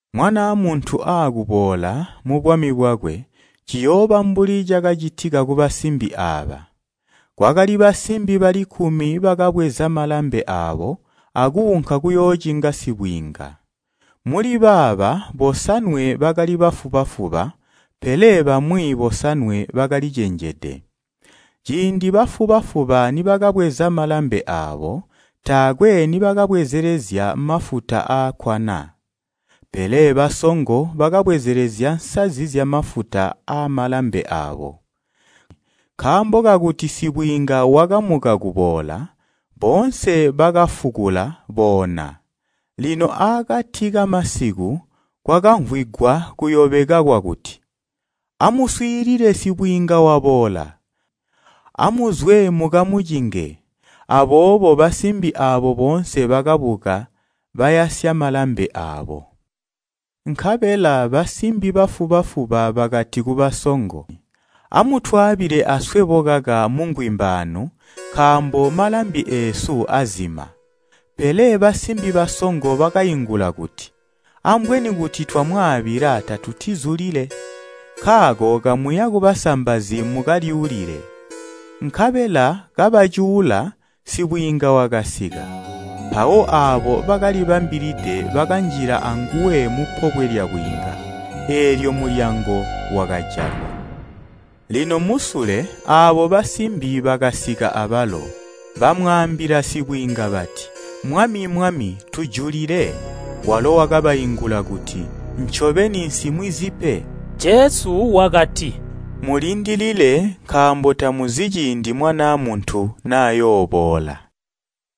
Mwanaa Muntu aakuboola mubwami bwakwe ciyooba mbuli cakacitika kubasimbi aaba: “Kwakali basimbi bali kkumi bakabweza malambe aabo, akuunka kuyoocinga sibwiinga. Muli baaba bosanwe bakali bafuba-fuba, pele bamwi bosanwe bakalicenjede. Ciindi bafuba-fuba nibakabweza malambe aabo, taakwe nibakabwezelezya mafuta aakkwana. Pele basongo bakabwezelezya nsazi zyamafuta aamalambi aabo. Nkaambo kakuti sibwiinga wakamuka kuboola, boonse bakafukula boona. Lino aakati kamasiku kwakamvwigwa kuyobeka kwakuti, ‘Amuswiilile sibwiinga waboola! Amuzwe mukamucinge!’ Aboobo basimbi aabo boonse bakabuka, bayasya malambi aabo. Nkabela basimbi bafuba-fuba bakati kubasongo, ‘Amutwaabile aswebo kaka mungwimba aanu nkaambo malambi eesu azima!’ Pele basimbi basongo bakaingula kuti, ‘Ambweni kuti twamwaabila tatutizulile. Nkaako kamuya kubasambazi mukalyuulile.’ Nkabela kabacuula, sibwiinga wakasika. Mpawo aabo bakalibambilide bakanjila anguwe mupobwe lyabwiinga, eelyo mulyango wakajalwa. Lino musule aabo basimbi bakasika abalo, bamwaambila sibwiinga bati, ‘Mwami, Mwami tujulile.’ Walo wakabaingula kuti, ‘Ncobeni, nsimwizi pe.’” Jesu wakati, “Mulindilile nkaambo tamuzi ciindi Mwanaa Muntu nayooboola.”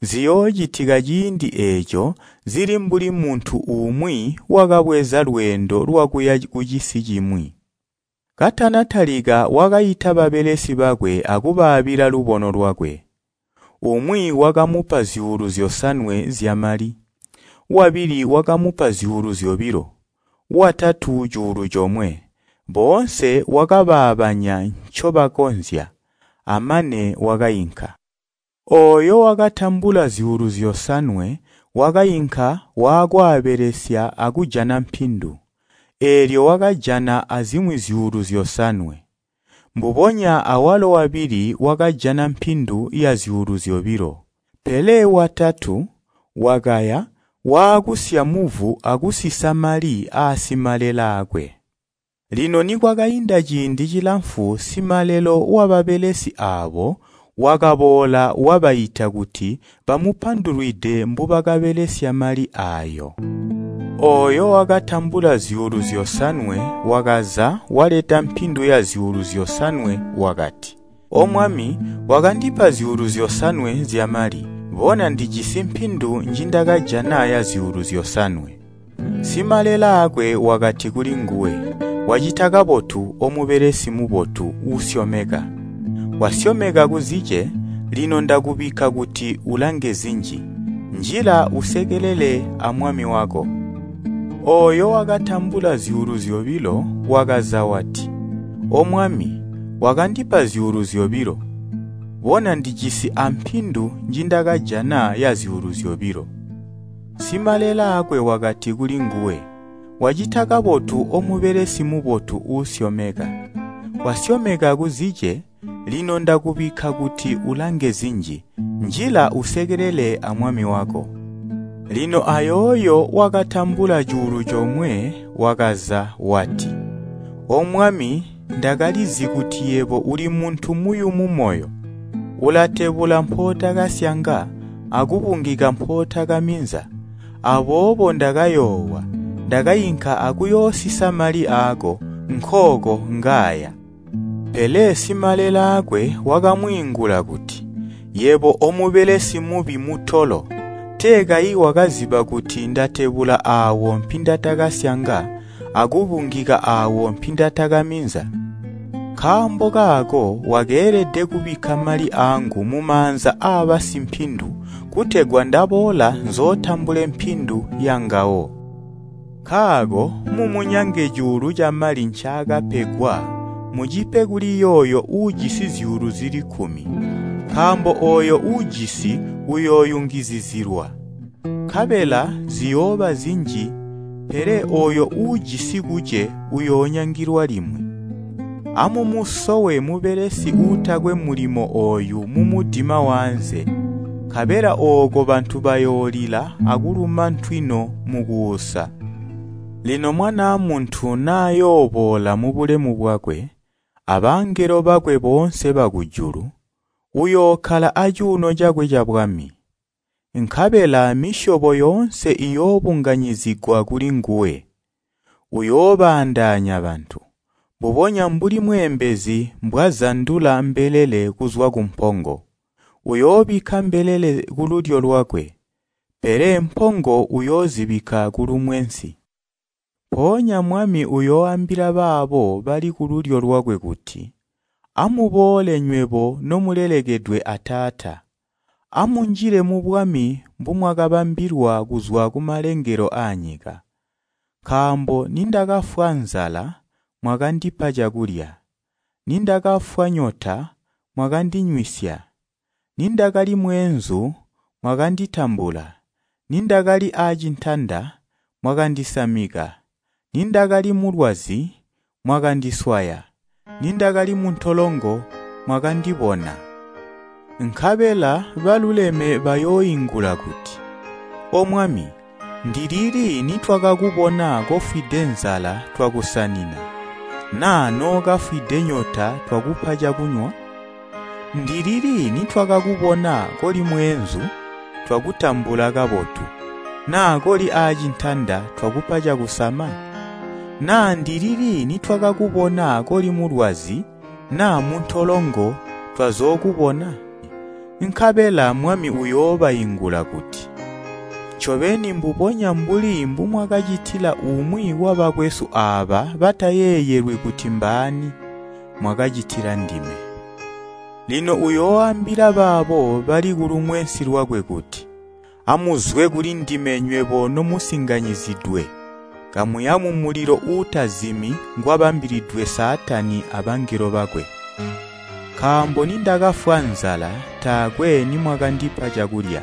“Ziyoocitika ciindi eeco zili mbuli muntu umwi wakabweza lweendo lwakuya kucisi cimwi. Katana talika wakaita babelesi bakwe akubaabila lubono lwakwe. Umwi wakamupa zyuulu zyosanwe zyamali, wabili wakamupa zyuulu zyobilo, watatu cuulu comwe. Boonse wakabaabanya ncobakonzya. Amane wakainka. Ooyo wakatambula zyuulu zyosanwe wakainka waakwaabelesya akujana mpindu, eelyo wakajana azimwi zyuulu zyosanwe. Mbubonya awalo wabili wakajana mpindu yazyuulu zyobilo. Pele watatu, wakaya waakusya muvu akusisa mali aasimalelaakwe. “Lino nikwakainda ciindi cilamfu simalelo wababelesi aabo wakaboola wabaita kuti bamupandulwide mbubakabelesya mali aayo. Ooyo wakatambula zyuulu zyosanwe wakaza waleta mpindu yazyuulu zyosanwe wakati, ‘O Mwami, wakandipa zyuulu zyosanwe zyamali. Bona ndijisi mpindu njindakajana yazyuulu zyosanwe.’ Simalelaakwe wakati kulinguwe, ‘Wacita kabotu omubelesi mubotu, uusyomeka, wasyomeka kuzice, lino ndakubikka kuti ulange zinji. Njila usekelele amwami wako.’ Ooyo wakatambula zyuulu zyobilo wakaza wati, ‘O Mwami, wakandipa zyuulu zyobilo. Bona ndijisi ampindu njindakajana yazyuulu zyobilo.’ Simalelaakwe wakati kulinguwe, ‘Wacita kabotu omubelesi mubotu uusyomeka, wasyomeka kuzice, lino ndakubikka kuti ulange zinji. Njila usekelele amwami wako.’ “Lino ayooyo wakatambula cuulu comwe wakaza wati, ‘O Mwami ndakalizi kuti yebo uli muntu muyumu moyo. Ulatebula mpootakasyanga akubungika mpootakaminza. Aboobo ndakayoowa, ndakainka akuyoosisa mali aako. Nkooko ngaaya!’ Pele simalelaakwe wakamwiingula kuti, ‘Yebo omubelesi mubi mutolo! Tee kayi wakaziba kuti ndatebula aawo mpindatakasyanga akubungika aawo mpindatakaminza? Nkaambo kaako wakeelede kubikka mali aangu mumaanza aabasimpindu kutegwa ndaboola nzootambule mpindu yangawo. Nkaako mumunyange cuulu camali ncaakapegwa mucipe kuli yooyo uujisi zyuulu zili kkumi. Nkaambo ooyo uujisi uyooyungizizilwa, nkabela ziyooba zinji pele ooyo uujisi kuce uyoonyangilwa limwi. Amumusowe mubelesi uutakwe mulimo ooyu mumudima waanze, nkabela ooko bantu bayoolila akuluma ntwino mukuusa.’ “Lino Mwanaa Muntu nayooboola mubulemu bwakwe, abangelo bakwe boonse bakujulu, uyookkala acuuno cakwe cabwami. Nkabela misyobo yoonse iyoobunganyizigwa kulinguwe, uyoobaandaanya bantu, mbubonya mbuli mweembezi mbwazandula mbelele kuzwa kumpongo. Uyoobikka mbelele kululyo lwakwe, pele mpongo uyoozibikka kulumwensi. Mpoonya Mwami uyooambila baabo bali kululyo lwakwe kuti, ‘Amuboole nywebo nomulelekedwe a Taata, amunjile mubwami mbumwakabambilwa kuzwa kumalengelo aanyika. Nkaambo nindakafwa nzala mwakandipa cakulya, nindakafwa nyota mwakandinywisya, nindakali mweenzu mwakanditambula, nindakali aacintanda mwakandisamika, nindakali mulwazi mwakandiswaya, nindakali muntolongo mwakandibona.’ Nkabela baluleme bayooingula kuti, ‘O Mwami, ndilili nitwakakubona kofwide nzala twakusanina, naa nookafwide nyota twakupa cakunywa? Ndilili nitwakakubona koli mweenzu twakutambula kabotu, naa koli aacintanda twakupa cakusama? Naa ndilili nitwakakubona koli mulwazi naa muntolongo twazookubona?’ Nkabela Mwami uyoobaingula kuti, ‘Ncobeni mbubonya mbuli mbumwakacitila umwi wabakwesu aaba batayeeyelwi kuti mbaani, mwakacitila ndime.’ “Lino uyooambila baabo bali kulumwensi lwakwe kuti, ‘Amuzwe kulindime nywebo nomusinganyizidwe, kamuya mumulilo uutazimi ngwabambilidwe Saatani abangelo bakwe. Nkaambo nindakafwa nzala taakwe nimwakandipa cakulya,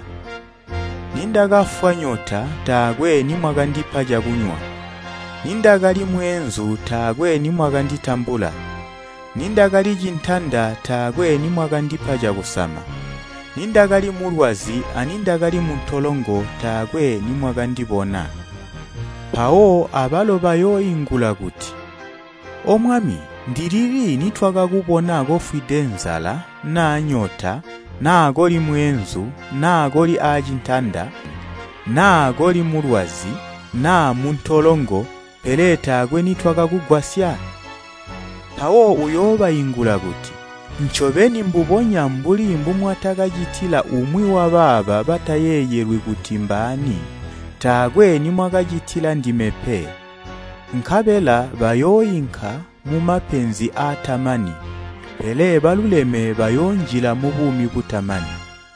nindakafwa nyota taakwe nimwakandipa cakunywa, nindakali mweenzu taakwe nimwakanditambula, nindakali cintanda taakwe nimwakandipa cakusama, nindakali mulwazi anindakali muntolongo taakwe nimwakandibona.’ Mpawo abalo bayooingula kuti ‘O Mwami, ndilili nitwakakubona kofwide nzala naa nyota naa koli mweenzu naa koli aacintanda naa koli mulwazi naa muntolongo pele taakwe nitwakakugwasya?’ Mpawo uyoobaingula kuti, ‘Ncobeni mbubonya mbuli mbumwatakacitila umwi wabaaba batayeeyelwi kuti mbaani, taakwe nimwakacitila ndime pe.’ Nkabela bayooinka mumapenzi aatamani, pele baluleme bayoonjila mubuumi butamani.”